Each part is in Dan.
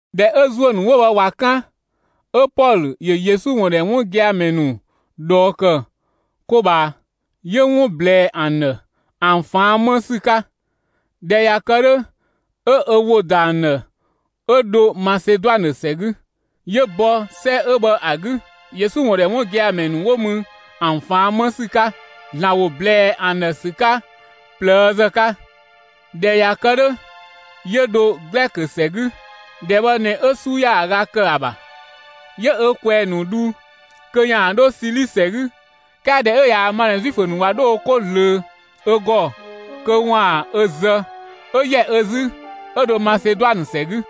꞊Dhɛ 'ö ‑zuö ‑nu 'wo bhë ꞊wa 'kan, 'ö Pɔlö ‑yö Yesu ‑wun ‑dhɛ 'wun gia‑ ‑mɛ ‑nu ꞊dhɔɔ ‑kë 'ko ꞊bhaa, 'yö 'wun ꞊blɛɛ ‑an ‑dhë, ‑an ꞊faan' 'më ‑sü 'ka. ꞊Dhɛ ꞊ya kë 'dhö, 'ö ö ‑wo ‑da ‑an ‑dhë 'ö dho Maseduanë ‑sɛ 'gü. 'Yö bɔ 'sɛ 'ö bhë ‑a 'gü, Yesu ‑wun ‑dhɛ 'wun gia‑ ‑mɛ ‑nu 'wo mü ‑an ꞊faan' 'më ‑sü 'ka, ‑Zlan ‑wo ꞊blɛɛ ‑an ‑dhë ‑sü 'ka ꞊plëëzë 'ka. ꞊Dhɛ ꞊ya kë 'dhö, 'yö dho Glɛkö ‑sɛ 'gü. ‑Dhɛ bhë ꞊nɛ 'ö 'su ‑yaaga ‑kë ‑a ‑bha. 'Yö ö ꞊kwɛɛ‑ ‑nu dhu kö 'yaan‑ 'dho Sili ‑sɛ 'gü. 'Kɛɛ ꞊dhɛ 'ö ꞊yaa‑ ma ꞊nɛ Zuifö ‑nu ꞊wa 'dho wo 'ko ꞊zlöö ö ‑gɔ kö ‑waan ö zë, 'ö ‑yɛ ö 'zü, 'ö dho Maseduanë ‑sɛ 'gü.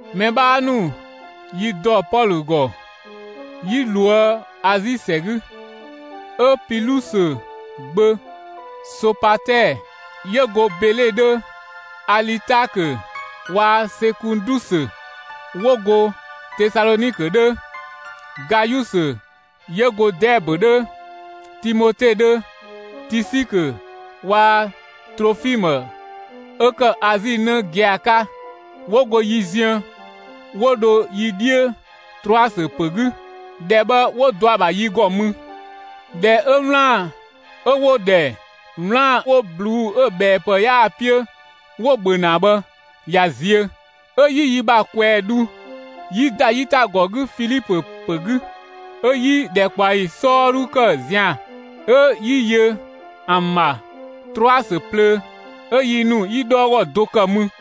Mɛ 'bhaa ‑nu yi ‑dɔ Pɔlö ‑gɔ, 'yi ꞊loë' Azi ‑sɛ 'gü; 'ö Pilusö gbö Sopatɛɛ 'yö go Bele 'dhö, Alitaakö waa‑ Sekundusö 'wo go Tesalɔnikö 'dhö, Gayusö 'yö go Dɛɛbö 'dhö, Timote 'dhö, Tisikö waa‑ Trofimë 'ö ‑kë Azi 'në gia‑ 'ka, 'wo go yi ziën, 'wo dho yi 'dhiö Trɔasö ‑pö 'gü. ‑Dhɛ bhë 'wo dɔ ‑a ‑bha yi ‑gɔ mü. ꞊Dhɛ 'ö 'wlaan‑ 'ö 'wo‑ ‑dhɛ 'wlaan‑ 'wo ꞊bluu'‑ 'ö‑ ꞊bhɛɛpë 'yaa‑ 'piö 'wo‑ ‑bhö ‑na bhë ꞊ya ziö, 'ö 'yi yi ‑bha ꞊kwɛɛ‑ dhu, 'yi ‑da 'yitagɔ 'gü Filipö ‑pö 'gü. 'Ö 'yi ‑dhɛkpaɔyi 'sɔɔdhu ‑kë zian‑, 'ö 'yi yö ‑an ‑bha Trɔasö plöö; 'ö yi ‑nu 'yi 'dhɔɔgɔ do ‑kë mü.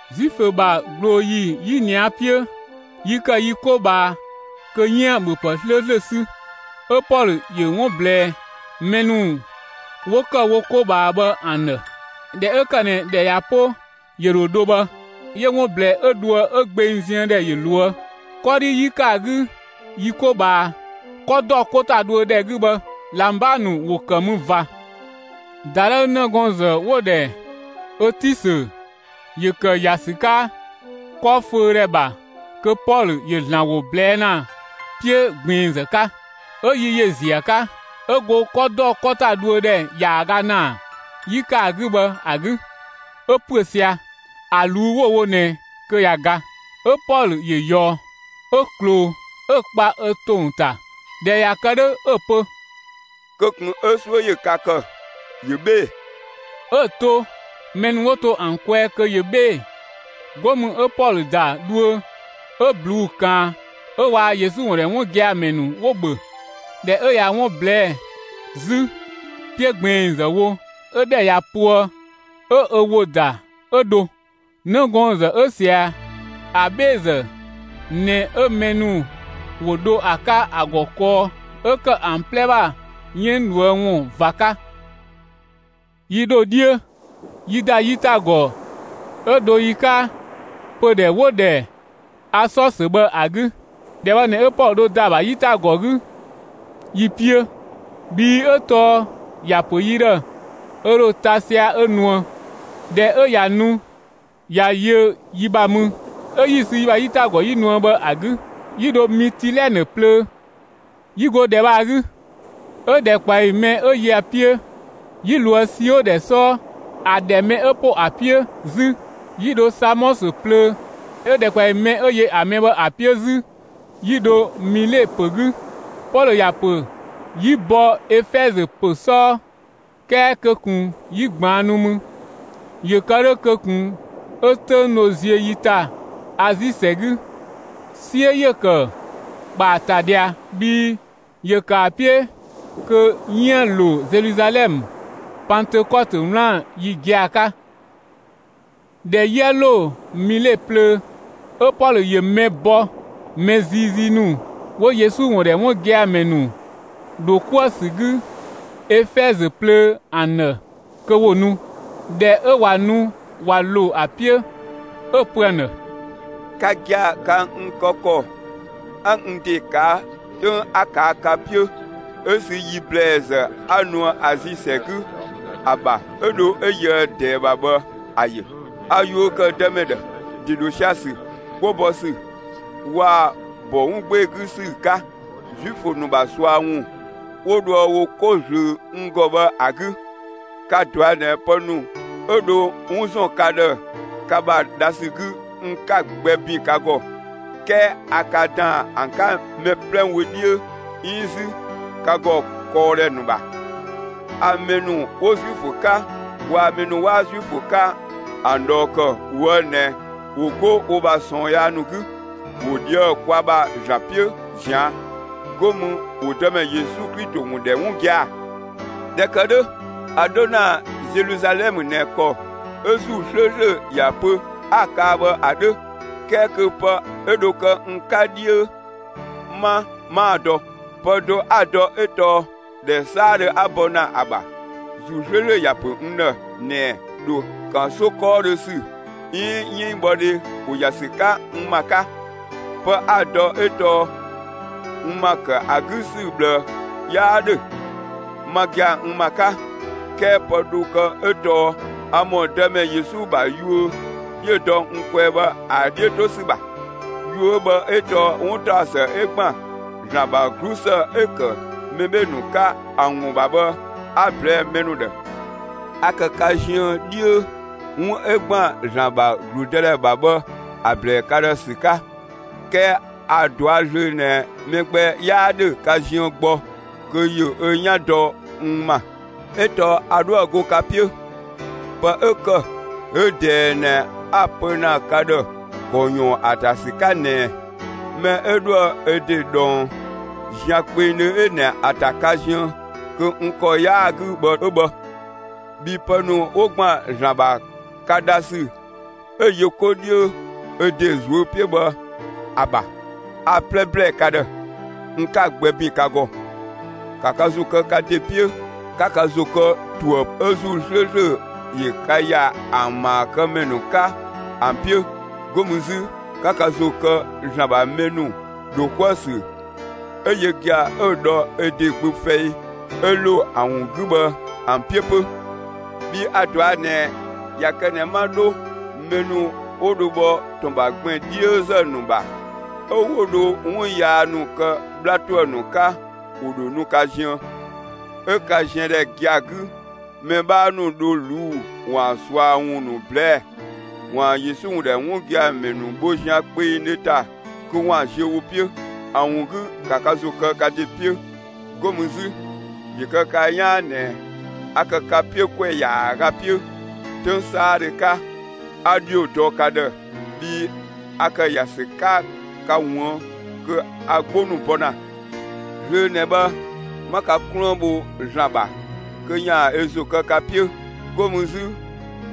Zuifö ‑bha ꞊glooyi 'yinia 'piö, yi ‑kë yi 'ko ꞊bhaa kö 'yiën‑ ‑bhöpë 'slööslö 'sü. 'Ö Pɔlö ‑yö 'wun ꞊blɛɛ mɛ ‑nu 'wo ‑kë wo 'ko ꞊bhaa bhë ‑an ‑dhë. ꞊Dhɛ 'ö ‑kë ꞊nɛ ‑dhɛ ꞊ya 'po, ‑yö ‑dho dho bhë, 'yö 'wun ꞊blɛɛ 'ö dhoë 'ö gbeng ziën ‑dhɛ ꞊loë'. 'Kɔdhi 'yi ‑kë ‑a 'gü yi 'ko ꞊bhaa, 'kɔ ‑dɔ 'ko ‑ta dhuö ‑dhɛ 'gü bhë ꞊labang ‑nu ‑wo ‑kë mü ꞊va. ‑Dadhëü 'nëgɔɔnzë 'wo‑ ‑dhɛ ötisö ‑yö ‑kë ‑ya ‑sü 'ka 'kɔ föödhɛ ‑bha kö Pɔlö ‑yö ‑Zlan ‑wo ꞊blɛɛ' ‑na 'piö ꞊gbiinzë 'ka; 'ö yi ‑yö ‑ziö ‑a 'ka. 'Ö go 'kɔ ‑dɔ 'kɔ ‑ta dhuö ‑dhɛ ‑yaaga ‑naa 'yi ‑kë ‑a 'gü bhë ‑a 'gü, 'ö ‑püö sia‑. ‑A ꞊luu'‑ 'wo‑ wo ꞊nɛ kö ꞊ya ga. 'Ö Pɔlö ‑yö ꞊yɔɔ, 'ö ꞊kloo, 'ö‑ kpa ö ‑tong ‑ta. ꞊Dhɛ ꞊ya kë 'dhö 'ö‑ pö: «Kö ꞊kun 'ö 'suö ‑yö ka ‑kë; ‑yö 'bhee‑!» 'Ö‑ to mɛ ‑nu 'wo to ‑an kwɛɛ kö ‑yö 'bhee‑. 'Go mü 'ö Pɔlö ‑da dhuö 'ö ꞊bluu'‑ ꞊kaan 'ö waa‑ Yesu ‑wun ‑dhɛ 'wun gia‑ ‑mɛ ‑nu 'wo‑ ‑bhö. ꞊Dhɛ 'ö ꞊ya 'wun ꞊blɛɛ'‑ 'zü 'piö ꞊gbiinzë wo, 'ö ‑dhɛ ꞊ya poë 'ö ö ‑wo ‑da 'ö dho. 'Nëgɔɔnzë 'ö ꞊sia ‑a 'bheezë ꞊nɛ 'ö mɛ ‑nu ‑wo dho ‑a 'ka ‑a ‑gɔ kɔɔ 'ö ‑kë ‑an 'plɛ ‑bha 'yënng ꞊dhuë' ‑wun ꞊va 'ka. Yi ‑dho 'dhiö, 'yi ‑da 'yitagɔ 'ö dho yi 'ka pödhɛ 'wo‑ ‑dhɛ Asɔsö bhë ‑a 'gü. ‑Dhɛ bhë ꞊nɛ 'ö Pɔlö dho ‑da ‑a ‑bha 'yitagɔ 'gü yi 'piö; bhii 'ö tɔɔ ‑ya ‑pö yi ‑dhë ö ‑dho ta sia‑ 'ö nuë. ꞊Dhɛ 'ö ꞊ya nu, ꞊ya yö yi ‑bha mü, 'ö 'yi‑ sü yi ‑bha 'yitagɔ 'yi nuë bhë ‑a 'gü, 'yi dho Mitilɛnë plöö. 'Yi go ‑dhɛ bhë ‑a 'gü, 'ö ‑dhɛkpaɔyi mɛ 'ö yö ‑a 'piö, yi ꞊loë' Sio ‑dhɛ 'sɔɔ. ‑A ‑dhɛ mɛ 'ö ‑po ‑a 'piö 'zü, 'yi dho Samɔsö plöö; 'ö ‑dhɛkpaɔyi mɛ 'ö yö ‑a mɛ bhë ‑a 'piö 'zü, 'yi dho Mile ‑pö 'gü. Pɔlö ‑ya ‑pö 'yi bɔ Efɛzö ‑pö 'sɔɔ; 'kɛɛ kö ꞊kun 'yi ꞊gbaannu mü, ‑yö kë 'dhö kö ꞊kun 'ö 'töng dho ‑ziö yi ‑ta Azi ‑sɛ 'gü. 'Siö ‑yö ‑kë ‑kpa ‑a ‑ta ꞊dhia, bhii ‑yö kë ‑a 'piö kö 'yiën‑ ‑lo Zeluzalɛmë, Pantëkɔtö 'wlaan‑ ‑yi gia‑ 'ka. ꞊Dhɛ 'yië ‑lo Mile plöö, 'ö Pɔlö ‑yö mɛ bɔ mɛ ziizii ‑nu 'wo Yesu ‑wun ‑dhɛ 'wun gia‑ ‑mɛ ‑nu ‑dho 'kuë‑ ‑sü 'gü Efɛzö plöö ‑an ‑dhë kö ‑wo nu. ꞊Dhɛ 'ö ꞊wa nu ꞊wa ‑lo ‑a 'piö, 'ö‑ pö ‑an ‑dhë: «Ka gia‑, ka n kë ‑kɔ 'a n ‑de ꞊kaa' 'töng 'a ꞊kaa' ka 'piö 'ö sü yi ‑blɛɛzë 'a nuë Azi ‑sɛ 'gü ‑a ‑bha 'ö dho 'ö yöë ꞊dɛɛ ‑bha bhë ‑a ‑yö: A yuö ‑kë Dëmɛ ‑dhë, ‑de ‑dho sia‑ ‑sü, 'gbo bɔ ‑sü waa‑ ‑bɔ 'wun 'gbee‑ 'gü ‑sü 'ka, Zuifö ‑nu ‑bha ꞊sua ‑wun 'wo dhoë wo 'ko ꞊zlöö n ‑gɔ bhë ‑a 'gü. Ka‑ ꞊dɔa' ꞊nɛ pë ‑nu 'ö dho 'wun ‑zɔn ka ‑dhë ka ‑bha dha ‑sü 'gü, n 'ka‑ gbɛ ‑bin ka ‑gɔ, 'kɛɛ a ka ꞊daan ‑an 'ka mɛ 'plɛ wö 'dhiö 'iin 'zü ka ‑gɔ kɔɔdhɛ ‑nu ‑bha. A mɛ ‑nu 'wo Zuifö 'ka, waa‑ mɛ ‑nu 'waa Zuifö 'ka ‑an ꞊dhɔɔ ‑kë ꞊woë' ꞊nɛ ‑wo 'go wo ‑bha ꞊sɔɔn yaa ‑nu 'gü, ‑wo ꞊dhië'‑ kwa ‑bha ‑Zlan 'piö ꞊zian', 'go mü ‑wo Dëmɛ Yesu Klito ‑wun ‑dhɛ 'wun gia‑. ꞊Dhɛ ‑kë 'dhö, a 'dho ‑na Zeluzalɛmë ꞊nɛ ‑kɔ 'ö ‑Zuu 'slööslö ‑ya pö 'a‑ kaa bhë ‑a 'dhö, 'kɛɛ kö pë 'ö dho kë n 'ka 'dhiö 'ma, 'maa‑ dɔ. Pë do 'a‑ dɔ 'ö tɔɔ ‑dhɛ 'saadhö 'a bɔ ‑na ‑a ‑bha, ‑Zuu 'slööslö ‑ya ‑pö n ‑dhë ꞊nɛɛ ‑dho ‑kanso 'kɔɔdhö ‑sü 'iin 'yënngbhɔdhe ‑wo ‑ya ‑sü 'ka n ‑ma 'ka. Pë 'a‑ dɔ 'ö tɔɔ n ‑ma ‑kë ‑a 'gü ‑sü ꞊bhlë 'yaa ‑dhö, ma gia‑ n ‑ma 'ka. 'Kɛɛ pë dho kë 'ö tɔɔ a ‑mɔ Dëmɛ Yesu ‑bha yuö 'yö‑ dɔ n kwɛɛ bhë ‑a 'dhiö 'to ‑sü ‑bha. Yuö bhë 'ö tɔɔ 'wuntaɔsë 'ö ‑gban ‑Zlan ‑bha 'glusë 'ö‑ ‑kë mɛ 'bhee‑ ‑nu 'ka, ‑a ‑wun ‑bha bhë 'a‑ ꞊blɛɛ'‑ mɛ ‑nu ‑dhë. A ‑kë ka ziën 'dhiö 'wun 'ö ‑gban ‑Zlan ‑bha ‑gludëdhɛ ‑bha bhë ‑a ꞊blɛɛ ka ‑dhë ‑sü 'ka. 'Kɛɛ a‑ ꞊dɔa' zlöö ꞊nɛ mɛ gbɛ 'yaa ‑dhö ka ziën gbɔ kö ‑yö ö 'yan dɔ n ‑ma, 'ö tɔɔ a 'dhoë‑ 'go ka 'piö. Pë 'ö ‑kë 'ö ꞊dɛɛ ꞊nɛ 'a‑ pö ‑na ka ‑dhë ‑kɔ ꞊yɔɔn ‑a ‑ta ‑sü 'ka ꞊nɛɛ: Mɛ 'ö 'dhoë‑ ö ‑de ꞊dhɔng zian kpengdhö ꞊nɛ ‑a ‑ta ka ziën kö n ‑kɔ 'yaa‑ 'gü bhë 'ö bhë. Bhii pë ‑nu 'wo ‑gban ‑Zlan ‑bha ka dha ‑sü 'ö‑ yö 'ko 'dhiö ö ‑de ꞊zuö' 'piö bhë ‑a ‑bha, a‑ 'plɛ ‑blɛɛ ka ‑dhë, n 'ka‑ gbɛ ‑bin ka ‑gɔ. ‑Ka ka ‑zo kë ka ‑de 'piö, 'ka ka ‑zo kë ‑tuë ‑pë 'ö ‑Zuu 'slööslö ‑yö ka ‑ya ‑an ‑maakëmɛ ‑nu 'ka ‑an 'piö! 'Go mü 'zü, ‑ka ka ‑zo kë ‑Zlan ‑bha mɛ ‑nu ‑dho 'kuë‑ ‑sü, 'ö yö gia‑ 'ö‑ dhɔ ö ‑de Gbö fɛi 'ö‑ ‑lo ‑an ‑wun 'gü bhë ‑an 'piö 'pö! Bhii a‑ ꞊dɔa' ꞊nɛ ꞊ya kë ꞊nɛ 'ma 'dho, mɛ ‑nu 'wo dho bhɔ ‑tɔn ‑bha gbɛn‑ 'dhiözë ‑nu ‑bha, 'ö 'wo dho 'wun yaa ‑nu kë 'bhla ‑tuë ‑nu 'ka, ‑wo ‑dho nu ka ziën. 'Ö ka ziëndhɛ gia‑ 'gü mɛ 'bhaa ‑nu dho ꞊luu'‑ ‑waan ꞊sua ‑wun ‑nu ꞊blɛɛ'‑, ‑waan Yesu ‑wun ‑dhɛ 'wun gia‑ ‑mɛ bho zian kpengdhö ‑ta kö ‑waan ziö wo 'piö. ‑A ‑wun 'gü ‑ka ka ‑zo kë ka ‑de 'piö! 'Go mü 'zü, ‑yö kë ka 'yaan ꞊nɛ a ‑kë ka 'piö ‑kwɛ ‑yaaga 'piö. 'Töng 'saadhö 'ka, 'a ‑dhio dɔ ka ‑dhë, bhii a ‑kë ‑ya ‑sü 'ka ka ꞊wuën' kö a 'gbo ‑nu bɔ ‑na. Zlöö ꞊nɛ bhë, 'ma ka 'kluën bho ‑Zlan ‑bha kö ‑yaan ö ‑zo kë ka 'piö. 'Go mü 'zü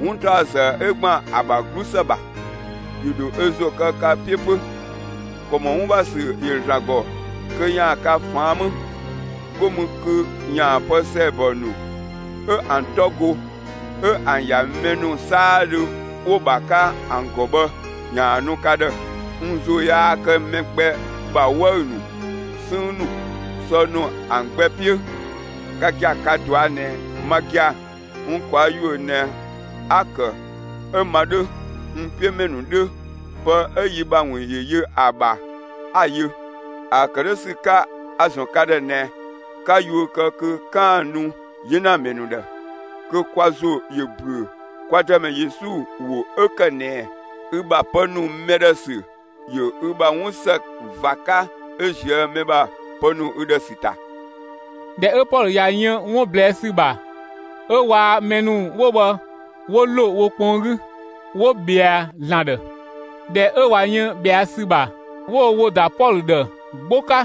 'wuntaɔsë 'ö ‑gban ‑a ‑bha 'glusë ‑bha, ‑yö ‑dho ö ‑zo kë ka 'piö 'pö. ‑Kɔ ‑mɔ 'wun ‑bha ‑sü ‑yö ‑Zlan ‑gɔ kö ‑yaan ka ꞊faan' 'më, 'go mü kö ‑yaan pë ‑sɛɛbɔ ‑nu 'ö ‑an 'tɔ go, 'ö ‑an ‑ya mɛ ‑nu 'saadhö 'wo‑ ‑bha 'ka ‑an ‑gɔ bhë ‑yaan nu ka ‑dhë. N ‑zo yaa kë mɛ gbɛ ‑bha 'wëü‑ ‑nu, 'sënng ‑nu, sɔ ‑nu ‑an gbɛ 'piö. Ka gia‑, ka‑ ꞊dɔa' ꞊nɛ ma gia‑ n ꞊kwaa' ‑yuö ꞊nɛ 'a‑ ‑kë 'ö ma 'dhö, n 'piö ‑mɛ ‑nu 'dhö, pë 'ö yi ‑bha ‑wun ‑yö yö ‑a ‑bha 'a‑ yö. ‑A ‑kë 'dhö ‑sü 'ka, a‑ ‑zɔn ka ‑dhë ꞊nɛ, 'ka yuö kë kö 'kaan‑ nu 'yenamɛ ‑nu ‑dhë, kö kwa ‑zo ‑yö ‑büö kwa Dëmɛ Yesu ‑wo 'ö ‑kë ꞊nɛɛ: ‹Ü ‑bha pë ‑nu mɛ ‑dhë ‑sü ‑yö ü ‑bha 'wun ‑së ꞊va 'ka 'ö ꞊zië' mɛ ‑bha pë ‑nu ü ‑dhë ‑sü ‑ta.›» ꞊Dhɛ 'ö Pɔlö ꞊ya yën 'wun ꞊blɛɛ' ‑sü ‑bha, 'ö waa‑ mɛ ‑nu 'wo bhë 'wo ‑lo wo kpɔn 'gü, 'wo ꞊bhɛa ‑Zlan ‑dhë. ꞊Dhɛ ö ꞊wa yën ꞊bhɛa' ‑sü ‑bha, 'wo wo ‑wo ‑da Pɔlö ‑dhë 'gbo 'ka,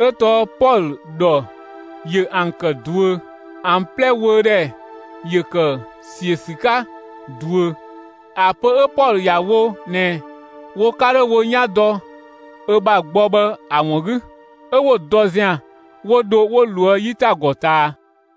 'ö tɔɔ Pɔlö ‑dhɔ ‑yö ‑an ‑kë ꞊duö. ‑An 'plɛ wöödhɛ ‑yö ‑kë ‑siö ‑sü 'ka ꞊duö, ‑a pö 'ö Pɔlö ‑ya wo ꞊nɛ wo 'ka 'dho wo 'yan dɔ ö ‑bha gbɔ bhë ‑a ‑wun 'gü. 'Ö 'wo‑ dɔ zian, 'wo dho 'wo ꞊loë' 'yitagɔ ꞊taa.